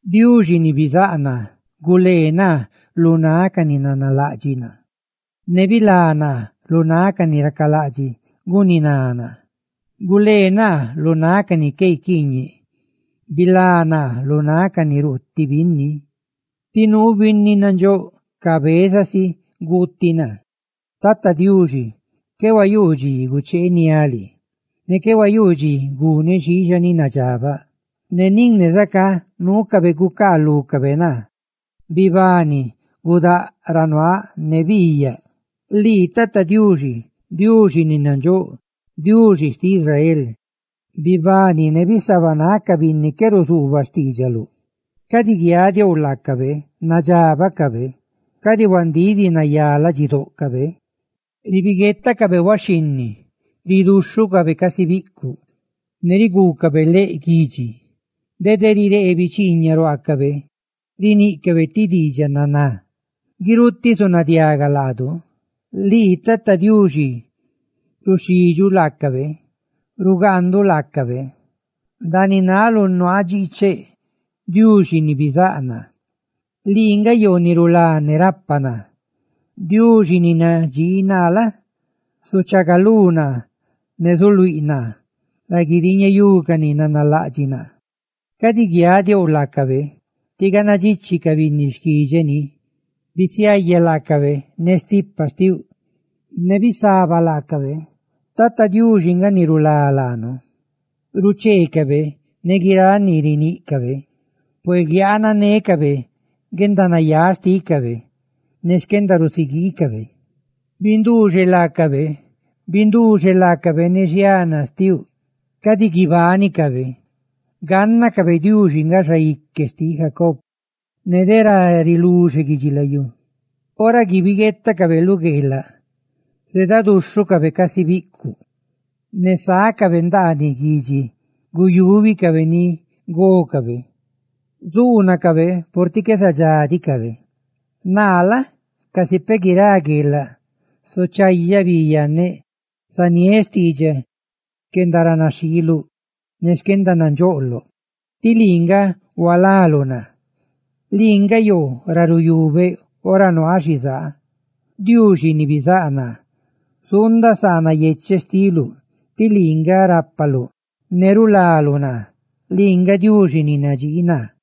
Diuxi ni bizáꞌ naa, gulee naa lu náꞌ ca ni nanalaꞌdxiꞌ naa; ne bilá naa lu náꞌ ca ni racalaꞌdxiꞌ guniná naa. Gulee naa lu náꞌ ca ni qué guiquiiñeꞌ, bilá naa lu náꞌ ca ni ruuti binni, ti nuu binni nandxóꞌ cabezasicaꞌ guuticaꞌ naa. Tata Diuxi, qué huayuu dxi gucheeniáꞌ lii; qué huayuu dxi guneꞌ xiixa ni nadxabaꞌ, nin ne zacá, nuucabe gucaalúcabe naa. ¡Bibani! ¡Bidxaagalú naa ne biiyaꞌ! Lii, Tata Diuxi, Diuxi ni nandxóꞌ, Diuxi xtiꞌ Israel, bibani ne bisabanáꞌ ca binni qué ruzuubaꞌ xtiidxaluꞌ; cadi guiadiouꞌ ca ni nadxabaꞌ ca, cadi huandíꞌ diꞌ nayá ladxidóꞌcabe. Ribiguetacabe huaxhinni, riduxhucabe casi biꞌcuꞌ, ne riguucabe leꞌ guidxi. Dede riree bichiiñaꞌ ruaacabe, riníꞌcabe ti diidxaꞌ naná: «¡Guirutiꞌ zunadiaga laadu!» Lii Tata Diuxi, ruxidxuꞌ laacabe; rugaanduꞌ laacabe. Ndaaniꞌ náluꞌ nuaaꞌ dxiicheꞌ, Diuxi ni bizáꞌ naa, lii nga yoo ni rulá ne rapa naa. Diuxi ni nadxii naa la? zuchaagalú naa; ne zuluíꞌ naa ra guidiiñeyú ca ni nanalaꞌdxiꞌ naa. Cadi guiadiouꞌ laacabe, tí ganna dxichi ca binni xquidxeꞌ ni; bisiaya laacabe ne stipa xtiuꞌ ne bisaba laacabe. ¡Tata Diuxi nga ni rulá laanu! Rucheecabe ne guiráꞌ ni riníꞌcabe; ¡Pué guiananécabe guendanayáꞌ xtícabe ne xquendarusiguiicabe! ¡Binduuxeꞌ laacabe, binduuxeꞌ laacabe ne xiana xtiuꞌ! ¡Cadi guibánicabe! ¡Gánnacabe Diuxi nga Xaique xtiꞌ Jacob ne de ra riluxe guidxilayú! Ora guibiguetacabe lu gueelaꞌ zeedaduxhucabe casi biꞌcuꞌ, ne sácabe ndaaniꞌ guidxi guyúbicabe ni gócabe, zuunacabe purtiꞌ qué zadxá diꞌcabe. Naa la? zuundaꞌ casi peꞌ guirá gueelaꞌ; zuchayaꞌ bi yanneꞌ zaniéꞌ xtiidxaꞌ xquendaranaxhiiluꞌ ne xquendanandxoꞌloꞌ. Tí lii nga hualaluꞌ naa, lii nga yoo ra ruyubeꞌ ora nuaaꞌ xizaa. Diuxi ni bizáꞌ naa, zuundaꞌ saa nayecheꞌ xtiluꞌ, tí lii nga stipa xtinneꞌ ni rulá naa; ¡lii nga Diuxi ni nadxii naa!